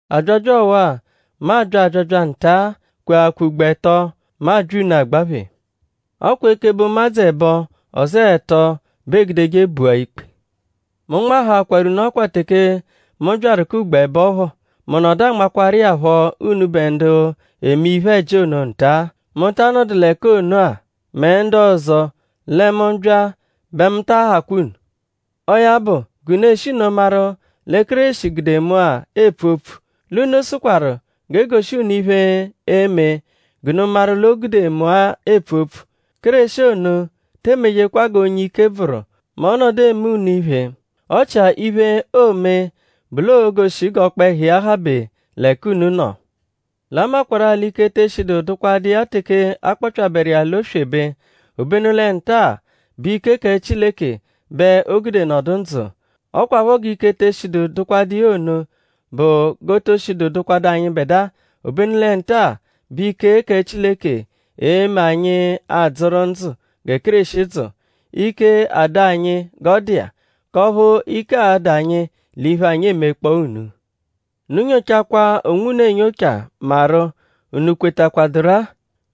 Abyabya ọwa-a, mu abya abyabya nta-a kweakwa ugbo ẹto, mu abya unu agbaphe. “Ọ kwa ekebe ụmadzu ẹbo; ọzoo ẹto bẹ eegudeje bua ikpe.” Mu nmahaakwaru unu ọkwa teke mu byaru k'ugbo ẹbo phọ. Mu nọdu anmakwaru iya phọ unubẹ ndu eme iphe-ẹji ono nta-a, mu ta anọdu l'ẹka ono-a; mẹ ndu ọzo; lẹ mu -bya bẹ mu taa hakwa unu. Ọo ya bụ; g'unu e -shi nno maru lẹ Kéreshi gude mu-a epfu opfu; l'unu sụkwaru g'e goshi unu iphe, e-me g'unu maru l'o gude mu-a epfu opfu. Kéreshi ono te emejekwa g'onye ike bvụru mẹ ọ -nọdu eme unu iphe. Ọ chia iphe, oo-me bụ l'oo-goshi g'ọkpehu iya habe l'ẹka unu nọ. L'a makwarụ-a l'ike te eshidu dụkwadu iya teke a kpọpyaberu iya l'oswebe; obenu lẹ nta-a bụ ike kẹ Chileke bẹ o gude nọdu ndzụ. Ọ kwaphọ g'ike te eshidu dụkwadu iya ono bụ g'o to shidu dụkwadu anyịbedua; obenu lẹ nta-a bẹ ike kẹ Chileke e-me anyi adzụru ndzụ gẹ Kéreshi dzụ; ike adụ anyi g'ọ dụ iya; k'ọphu ike a-dụ anyi l'iphe, anyi emekpọo unu. Unu nyochakwaa onwunu enyocha maru?unu kwetakwaduru-a?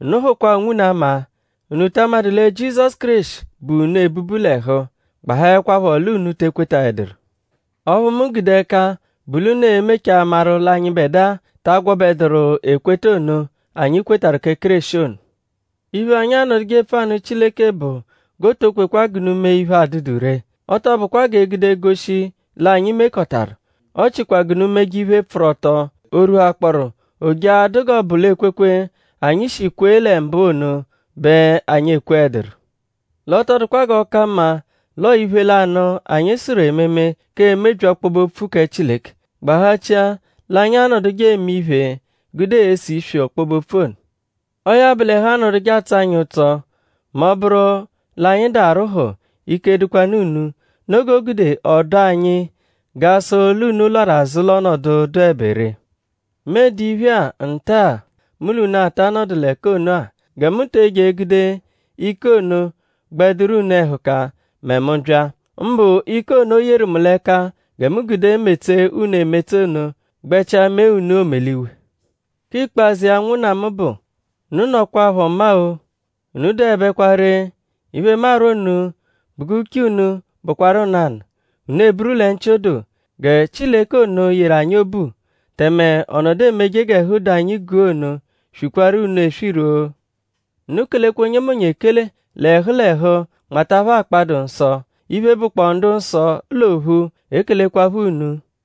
Unu hụkwa onwunu ama.?Unu ta amadụ lẹ Jizọsu Kéreshi bu unu ebubu l'ẹhu? gbahaẹkwapho l'unu te ekwetaẹduru. Ọphu mu gude ẹka bụ l'unu e-mechaa maru l'anyịbedua ta agwọbeduru ekweta ono, anyi kwetarụ kẹ Kéreshi ono. Iphe, anyi anọduje epfu anụ Chileke bụ g'o to kwekwa g'unu mee iphe, adụdu ree. Ọ tọ bụkwa g'e gude goshi l'anyi mekọtaru; ọ chikwa g'unu meje iphe, pfụru ọto; o rwuhakpọoru o jee a-dụ g'ọ bụ l'ekwekwe, anyi shi kwe lẹ mbụ ono bẹ anyi ekweẹduru. L'ọ tọ dụkwa g'ọ ka mma l'ọo iphe lanụ, anyi sụru ememe k'emebyi ọkpobe-opfu kẹ Chileke; gbahachia l'anyi a-nọduje eme iphe gude ese iswi ọkpobe-opfu ono. Ọo ya bụ l'ẹhu anọduje atsọ anyi ụtso mẹ ọ -bụru l'anyi dụ arwụhu; ike dụkwanu unu. Noo g'o gude ọ dụ anyi g'a sụ l'unu lwarụ azụ l'ọnodu, dụebe ree. Mu ede iphe-a nta-a, mu l'unu ata anọdu l'ẹka ono-a. Gẹ mu te eje egude ike ono gbẹ dụru unu ẹhuka mẹ mu -bya. Mbụ ike ono, o yeru mu l'ẹka gẹ mu gude metsee unu emetse ono gbẹchia mee unu omeliwe. Kẹ ikpazụ iya ụnwunna mu bụ; unu nọkwapho ọma-o. Unu dụebekwa ree; iphe, mu arwọ unu bụ g'uche unu bụkwaru nanụ. Unu eburu lẹ nchị-odoo. Gẹ Chileke ono yeru anyi obu tẹme ọ nọdu emeje g'ẹhu dụ anyi guu ono swikwaru unu eswiru-o. Unu kelekwa onyemonye ekele l'ẹhu l'ẹhu nmata phẹ akpa, dụ nsọ. Iphe, bụkpoo ndu-nsọ l'ophu l'ekelekwaphọ unu.